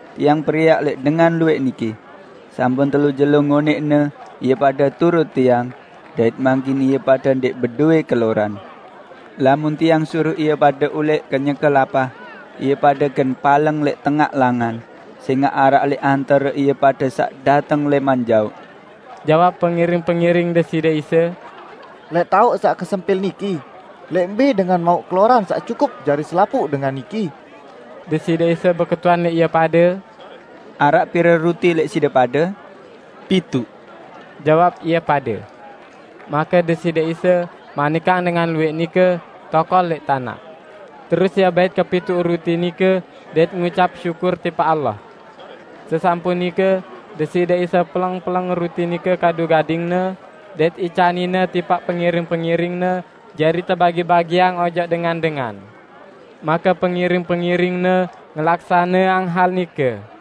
"Tiang periak lẽq dengan luwẽq niki. Sampun telu jelo ngonẽqne ie pade turut Tiang, dait mangkin ie pade ndẽq bedowẽ keloran. Lamun Tiang suruq ie pade ulẽq kenyeke lapah, ie pade gen paleng lẽq tengaq langan, sẽngaq araq lẽq antare ie pade saq dateng lẽman jaoq." Jawab pengiring-pengiring Deside Isa, "Lẽq taoq saq kesempil niki, lẽq mbẽ dengan mauq keloran saq cukup jari selapuq dengan niki?" Deside Isa beketuan lẽq ie pade, "Araq pire ruti lẽq side pade?" "Pituq," jawab ie pade. Make Deside Isa manikang dengan luwẽq nike tokol lẽq tanaq. Terus Ie bait kepituq ruti nike dait ngucap syukur tipaq Allah. Sesampun nike, Deside Isa peleng-peleng ruti nike kadu gading-Ne dait icanin-Ne tipaq pengiring-pengiring-Ne jari tebagi-bagiang ojok dengan-dengan. Make pengiring-pengiring-Ne ngelaksaneang hal nike.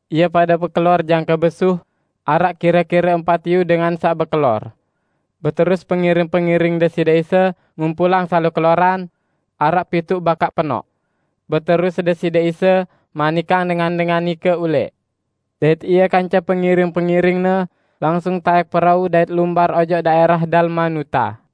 Ie pade bekelor jangke besuh -- araq kire-kire empat iyu dengan saq bekelor. Beterus pengiring-pengiring Deside Isa ngumpulang salo keloran -- araq pituq bakaq penoq. Beterus Deside Isa manikang dengan-dengan nike ulẽq, dait Ie kance pengiring-pengiring-Ne langsung taẽk perau dait lumbar ojok daẽrah Dalmanuta.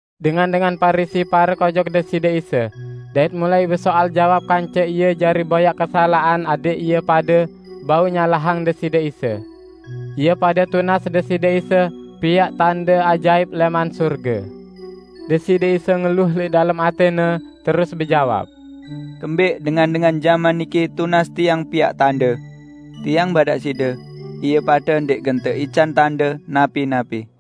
Dengan-dengan Parisi parek ojok Deside Isa, dait mulai besoal jawab kance Ie jari boyaq kesalaqan adẽq ie pade bau nyalahang Deside Isa. Ie pade tunas Deside Isa piaq tande ajaip lẽman sorge. Deside Isa ngeluh lẽq dalem atẽ-Ne terus bejawab, "Kembẽq dengan-dengan jaman niki tunas Tiang piaq tande? Tiang badaq side, ie pade ndẽq gen teican tande napi-napi!"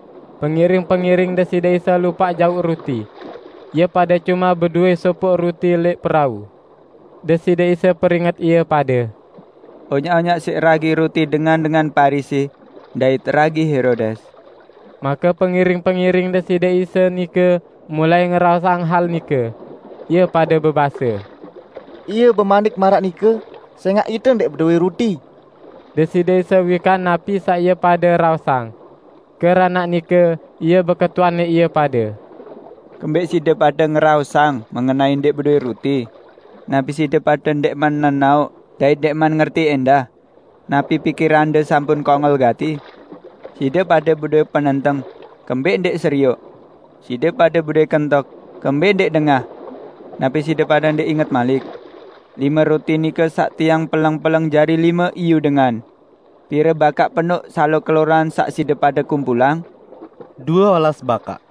Pengiring-pengiring Deside Isa lupaq jauq ruti. Ie pade cume bedowẽ sopoq ruti lẽq perau. Deside Isa peringet ie pade, "Onyaq-onyaq siq ragi ruti dengan-dengan Parisi dait ragi Herodes." Make pengiring-pengiring Deside Isa nike mulai ngeraosang hal nike. Ie pade bebase, "Ie bemanik maraq nike, sẽngaq ite ndẽq bedowẽ ruti." Deside Isa wikan napi saq ie pade raosang. Keranaq nike Ie beketuan lẽq ie pade, "Kembẽq side pade ngeraosang mengenai ndẽq bedowẽ ruti? Napi side pade ndẽqman nenaoq dait ndẽqman ngerti ẽndah? Napi pikirande sampun kongol gati? Side pade bedowẽ penenteng -- kembẽq ndẽq serioq? Side pade bedowẽ kentok -- kembẽq ndẽq dengah? Napi side pade ndẽq inget malik, lime ruti nike saq Tiang peleng-peleng jari lime iyu dengan? Pire bakaq penoq salo keloran saq side pade kumpulang?" "Due olas bakaq,"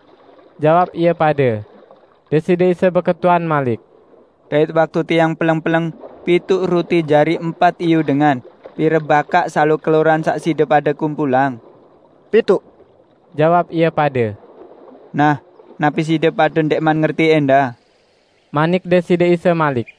jawab ie pade. Deside Isa beketuan malik, "Dait waktu Tiang peleng-peleng pituq ruti jari empat iyu dengan, pire bakaq salo keloran saq side pade kumpulang?" "Pituq," jawab ie pade. "Nah, napi side pade ndẽqman ngerti ẽndah?" manik Deside Isa malik.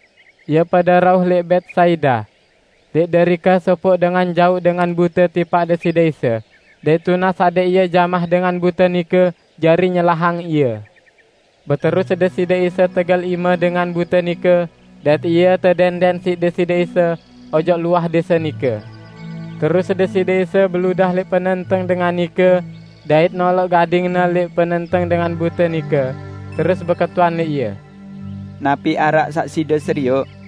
Ie pade rauh lẽq Betsaida. Lẽq derike sopoq dengan jauq dengan bute tipaq Deside Isa, dait tunas adẽq Ie jamah dengan bute nike jari nyelahang ie. Beterus Deside Isa tegel ime dengan bute nike dait ie tedẽndẽn siq Deside Isa ojok luah dẽse nike. Terus Deside Isa beludah lẽq penenteng dengan nike, dait noloq gading-Ne lẽq penenteng dengan bute nike, terus beketuan lẽq ie, "Napi araq saq side serioq?"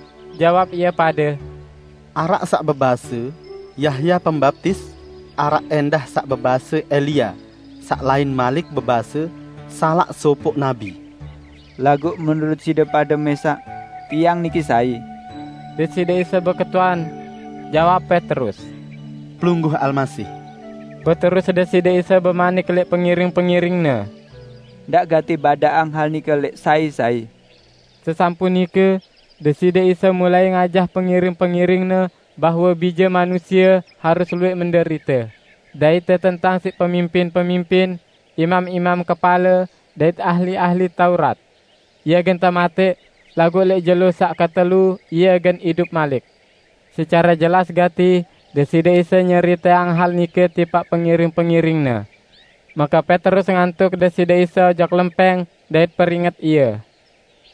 Jawab ie pade, "Araq saq bebase: Yahya Pembaptis. Araq ẽndah saq bebase Elia, saq lain malik bebase: salaq sopoq nabi." "Laguq menurut side pade mẽsaq, Tiang niki sai?" Deside Isa beketuan. Jawab Petrus, "Pelungguh Almasih!" Beterus Deside Isa bemanik lẽq pengiring-pengiring-Ne, "Ndaq gati badaqang hal nike lẽq sai-sai." Sesampun nike, Deside Isa mulai ngajah pengiring-pengiring-Ne bahwe Bije Manusie harus luwẽq menderite, dait tetentang siq pemimpin-pemimpin, imam-imam kepale, dait ahli-ahli Taurat. Ie gen tematẽq, laguq lẽq jelo saq ketelu Ie gen idup malik. Secare jelas gati Deside Isa nyeriteang hal nike tipaq pengiring-pengiring-Ne. Make Petrus ngantuq Deside Isa ojok lempẽng dait peringet Ie.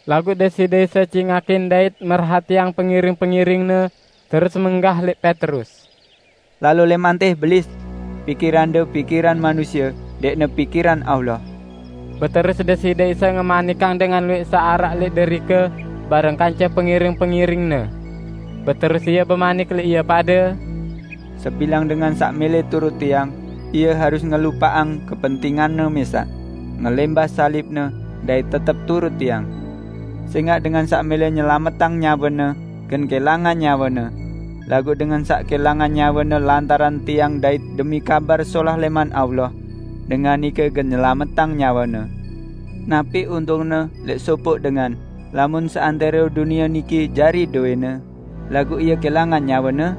Laguq Deside Isa cingakin dait merhatiang pengiring-pengiring-Ne, terus menggah lẽq Petrus, "Lalo lẽman tẽ, Belis! Pikirande pikiran manusie, ndẽqne pikiran Allah!" Beterus Deside Isa ngemanikang dengan luwẽq saq araq lẽq derike bareng kance pengiring-pengiring-Ne. Beterus Ie bemanik lẽq ie pade, "Sebilang dengan saq mẽlẽ turut Tiang, ie harus ngelupaqang kepentinganne mẽsaq, ngelẽmbah salibne, dait tetep turut Tiang. Sẽngaq dengan saq mẽlẽ nyelametang nyawene, gen kẽlangan nyawene. Laguq dengan saq kẽlangan nyawene lantaran Tiang dait demi Kabar Solah lẽman Allah, dengan nike gen nyelametang nyawene. Napi untungne lẽq sopoq dengan, lamun seantẽro dunie niki jari dowẽne, laguq ie kẽlangan nyawene?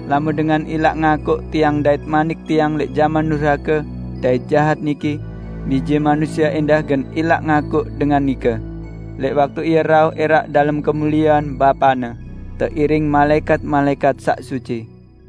Lamun dengan ilaq ngakuq Tiang dait manik Tiang lẽq jaman durhake dait jahat niki, Bije Manusie ẽndah gen ilaq ngakuq dengan nike, lẽq waktu Ie rauh ẽraq dalem kemuliean Bapa-Ne, teiring malaẽkat-malaẽkat saq suci."